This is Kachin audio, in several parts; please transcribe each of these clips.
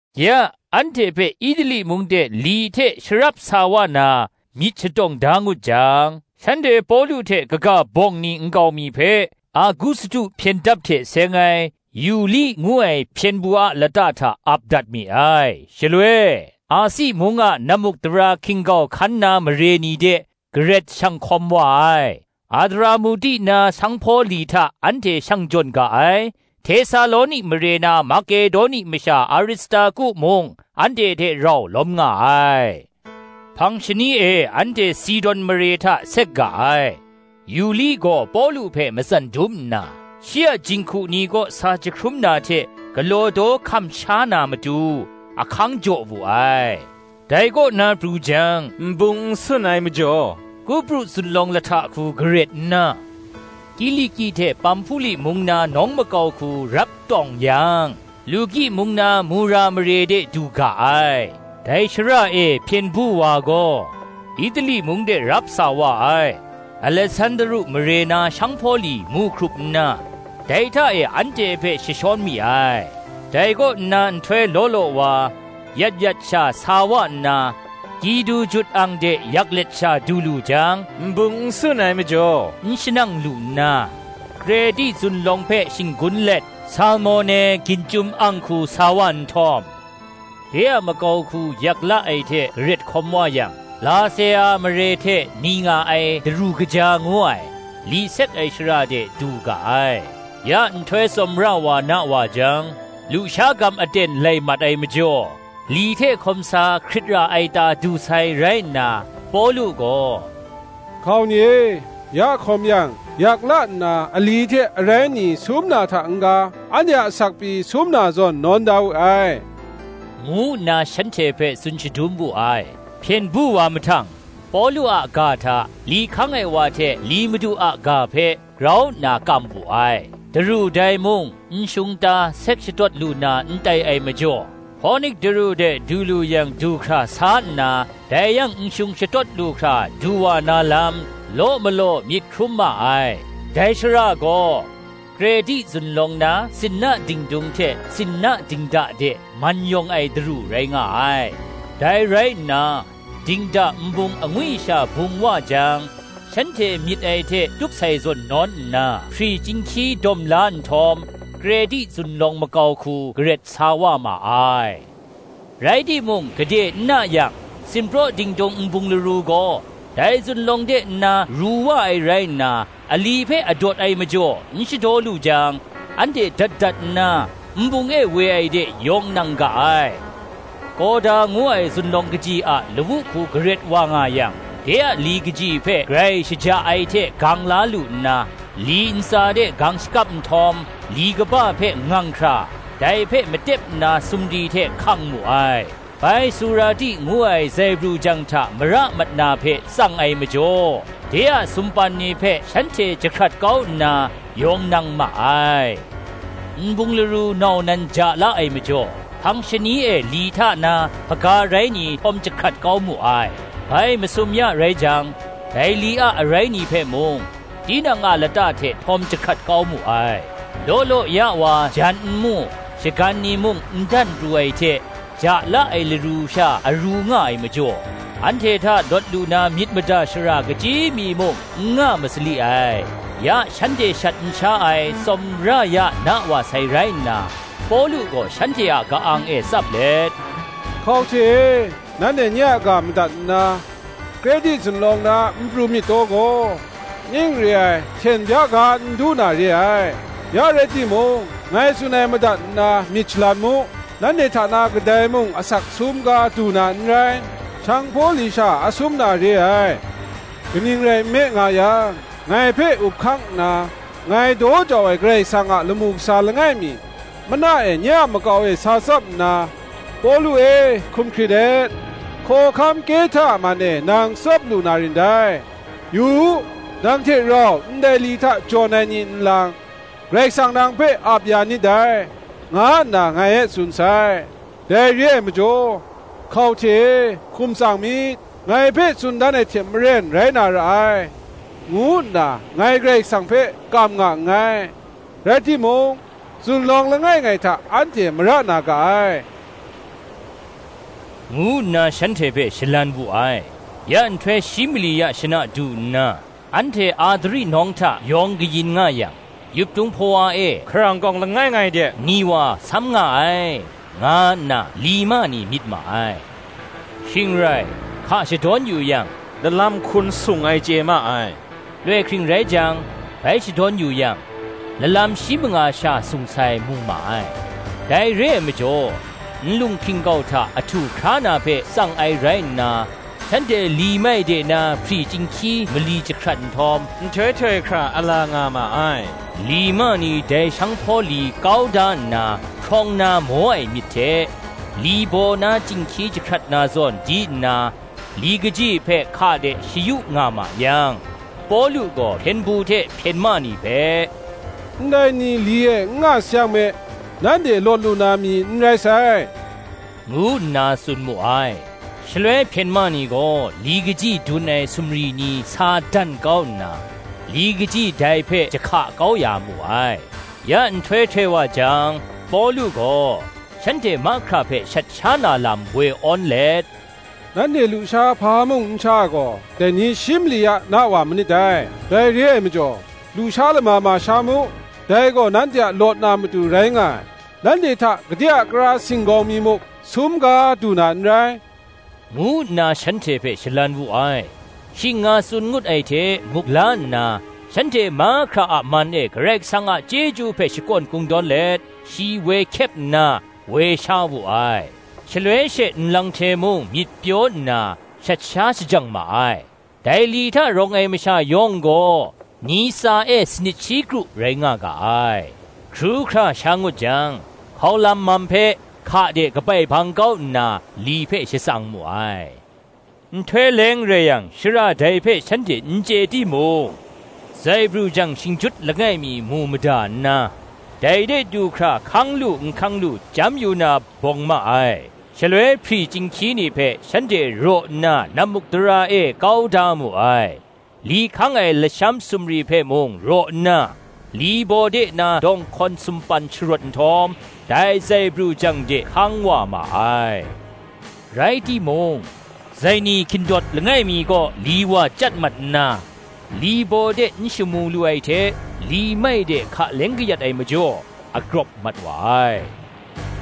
Ya, anhte hpe Itali mung de li hte sharap sa wa na myit shatawng da ngut jang, shanhte Pawlu hte kaga bawng ni nkau mi hpe, Agustu hpyen dap hte seng ai, Yuli ngu ai hpyen du a lata hta ap dat mi ai. Shaloi, Asi mung a nammukdara hkin-gau hkan na mare ni de garet shang hkawm wa ai, Adramuti na sanghpaw li hta anhte shang jawn ga ai: Htesaloni mare na Makedoni masha Aristarku mung anhte hte rau lawm nga ai. Hpang shani e anhte Sidon mare hta sek ga ai; Yuli gaw Pawlu hpe matsan dum nna, shi a jinghku ni kaw sa jahkrum na hte galaw daw hkam sha na matu, ahkang jaw wu ai. Dai kaw na pru jang, nbung n sun ai majaw, Kupru zunlawng lahta hku garet nna, Kiliki hte Pamhpuli mung na nawng makau hku rap tawng yang, Luki mung na Mura mare de du ga ai. Dai shara e hpyen du wa gaw, Itali mung de rap sa wa ai Alesandru mare na sanghpaw li mu hkrup nna, dai hta e anhte hpe jashawn mi ai. Dai kaw nna nhtoi law law wa, yat yat sha sa wa nna, Kidu jut ang de yak let sha du lu jang, nbung n sun ai majaw, n shanang lu nna, Kreti zunlawng hpe shinggun let, Salmone ginchyum ang hku sa wa nhtawm, de a makau hku yak la ai hte garet hkawm wa yang, Lasea mare hte ni nga ai Daru Kaja ngu ai, li sek ai shara de du ga ai. Ya nhtoi tsawmra wa na wa jang, lusha gam aten lai mat ai majaw, li hte hkawm sa hkrit ra ai ta du sai rai nna, Pawlu gaw, “Hkau ni e, ya hkawm yang, yak la nna ali hte arai ni sum na hta n-ga, anhte a asak pyi sum na zawn nawn da we ai,” ngu nna shanhte hpe tsun shadum wu ai. Hpyen du wa mahtang, Pawlu a ga hta, Li hkang ai wa hte li madu a ga hpe, grau nna kam wu ai. Daru dai mung nshung ta sek shatawt lu na n tai ai majaw, Hponik daru de du lu yang du hkra sa nna, dai yang nshung shatawt lu hkra du wa na lam, law malaw myit hkrum ma ai: dai shara gaw, Kreti zunlawng na sinna dingdung hte sinna dingda de man yawng ai daru rai nga ai. Dai rai nna, dingda nbung angwi sha bung wa jang, shanhte myit ai hte tup sai zawn nawn nna, hpri chyinghkyi dawm la nhtawm, Kreti zunlawng makau hku garet sa wa ma ai. Rai timung gade n na yang, sinpraw dingdung nbung laru gaw, dai zunlawng de nna ru wa ai rai nna, ali hpe adawt ai majaw n shadaw lu jang, anhte dat dat nna, nbung e woi ai de yawng nang ga ai. Kawda ngu ai zunlawng kaji a lawu hku garet wa nga yang, de a li kaji hpe grai shaja ai hte gang la lu nna, li ntsa de gang shakap nhtawm, li kaba hpe ngang hkra, dai hpe matep nna sumri hte hkang mu ai; bai Surti ngu ai zaibru jang hta mara mat na hpe tsang ai majaw, de a sumpan ni hpe shanhte jahkrat kau nna, yawng nang ma ai. Nbung laru nau nan ja la ai majaw, hpang shani e li hta na hpaga rai ni htawm jahkrat kau mu ai: bai masum ya rai jang, dai li a arai ni hpe mung, tinang a lata hte htawm jahkrat kau mu ai. Law law ya wa jan n mu, shagan ni mung n dan pru ai hte, ja la ai laru sha aru nga ai majaw, anhte hta lawt lu na myit mada shara kachyi mi muk n nga masali ai. Ya shanhte shat n sha ai, tsawmra ya na wa sai rai nna, Pawlu gaw shanhte a ka-ang e tsap let, “Hkau hte e, nanhte nye a ga madat nna, Kreti zunlawng na n pru myit taw gaw, ning re ai hten bya ga n du na re ai. Ya rai timung, ngai tsun ai madat nna myit shalan mu; nanhte hta na kadai mung asak sum ga du na n rai; sanghpaw li sha asum na re ai. Kaning rai nme nga yang, ngai hpe up hkang nna, ngai daw jau ai Karai Kasang a lamu kasa langai mi, mana e nye a makau e sa tsap nna, ‘Pawlu e, hkum hkrit et; hkawhkam Kehta a man e nang tsap lu na rin dai; yu u, nang hte rau ndai li hta jawn ai ni nlang, Karai Kasang nang hpe ap ya nit dai,’ nga nna ngai e tsun sai. Dai re ai majaw, Hkau hte e, hkum tsang myit; ngai hpe tsun dan ai hte maren rai na ra ai, ngu nna, ngai Karai Kasang hpe kam nga nngai. Rai timung, zunlawng langai ngai hta anhte mara na ga ai,” ngu nna shanhte hpe shalan wu ai. Ya nhtoi shi mali ya shana du nna, anhte Adri nawng hta yawng kayin nga yang, yuptung hpawa e, hkarang kawng langai ngai de ni wa sam nga ai, nga nna li ma ni myit ma ai. Shing rai, hka shadawn yu yang, lalam hkun sung ai chye ma ai; loi hkring rai jang, bai shadawn yu yang, lalam shi manga sha sung sai mu ma ai. Dai re ai majaw, nlung hkin-gau hta ahtu hkra na hpe tsang ai rai nna, shanhte li mai de na hpri chyinghkyi mali jahkrat nhtawm, nhtoi htoi hkra ala nga ma ai. Li ma ni dai sanghpaw li kau da nna hprawng na maw ai myit hte, li baw na chyinghkyi jahkrat na zawn di nna, li kaji hpe hka de shayu nga ma yang, Pawlu gaw hpyen du hte hpyen ma ni hpe, “Ndai ni li e n nga sayang me, nanhte lawt lu na mi n rai sai,” ngu nna tsun mu ai. Shaloi hpyen ma ni gaw li kaji dun ai sumri ni sa dan kau nna, li kaji dai hpe jahka kau ya mu ai. Ya nhtoi htoi wa jang, Pawlu gaw, shanhte mahkra hpe shat sha na lam woi awn let, “Nanhte lusha hpa mung n sha ai gaw, dai ni shi mali ya na wa manit dai: dai re ai majaw, lusha lama ma sha mu; dai gaw nanhte a lawt na matu rai nga ai; nanhte hta gade a kara singgawng mi muk sum ga du na n rai,” ngu nna shanhte hpe shalan wu ai. Shing nga tsun ngut ai hte muk la nna, shanhte mahkra a man e Karai Kasang a chyeju hpe shakawn kungdawn let, shi woi hkyep nna, woi sha wu ai. Shaloi she nlang hte mung myit pyaw nna, shat sha shajang ma ai. Dai li hta rawng ai masha yawng gaw, ni tsa e sanit shi kru rai nga ga ai. Hkru hkra sha ngut jang, hkaulan mam hpe hka de kabai bang kau nna, li hpe shatsang mu ai. Nhtoi leng rai yang, shara dai hpe shanhte n chye timung, zaibru jang shingjut langai mi mu mada nna, dai de du hkra hkang lu n hkang lu chyam yu na, bawng ma ai. Shaloi hpri chyinghkyi ni hpe shanhte raw nna nammukdara e kau da mu ai; li hkang ai lasham sumri hpe mung raw nna, li baw de na dawnghkawn sumpan sharawt nhtawm, dai zaibru jang de hkang wa ma ai. Rai timung, zaini hkindawt langai mi kaw li wa chyat mat nna, li baw de n shamu lu ai hte, li mai de hka leng kayat ai majaw, agrawp mat wa ai.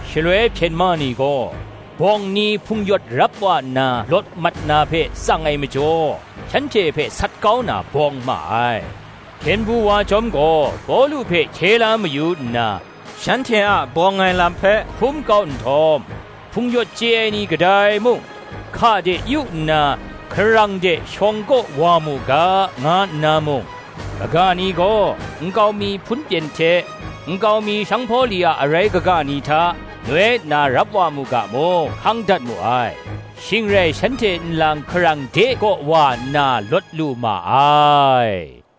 Shaloi hpyen ma ni gaw, bawng ni hpung-yawt rap wa nna lawt mat na hpe tsang ai majaw, shanhte hpe sat kau na bawng ma ai. Hpyen du wa chyawm gaw, Pawlu hpe hkye la mayu nna, shanhte a bawng ai lam hpe hkum kau nhtawm, hpung-yawt chye ai ni kadai mung, hka de yu nna, hkarang de shawng kaw wa mu ga, nga nna mung; kaga ni gaw, nkau mi hpunpyen hte, nkau mi sanghpaw li a arai kaga ni hta, noi nna rap wa mu ga mung, hkang dat mu ai. Shing rai shanhte nlang hkarang de kaw wa nna lawt lu ma ai.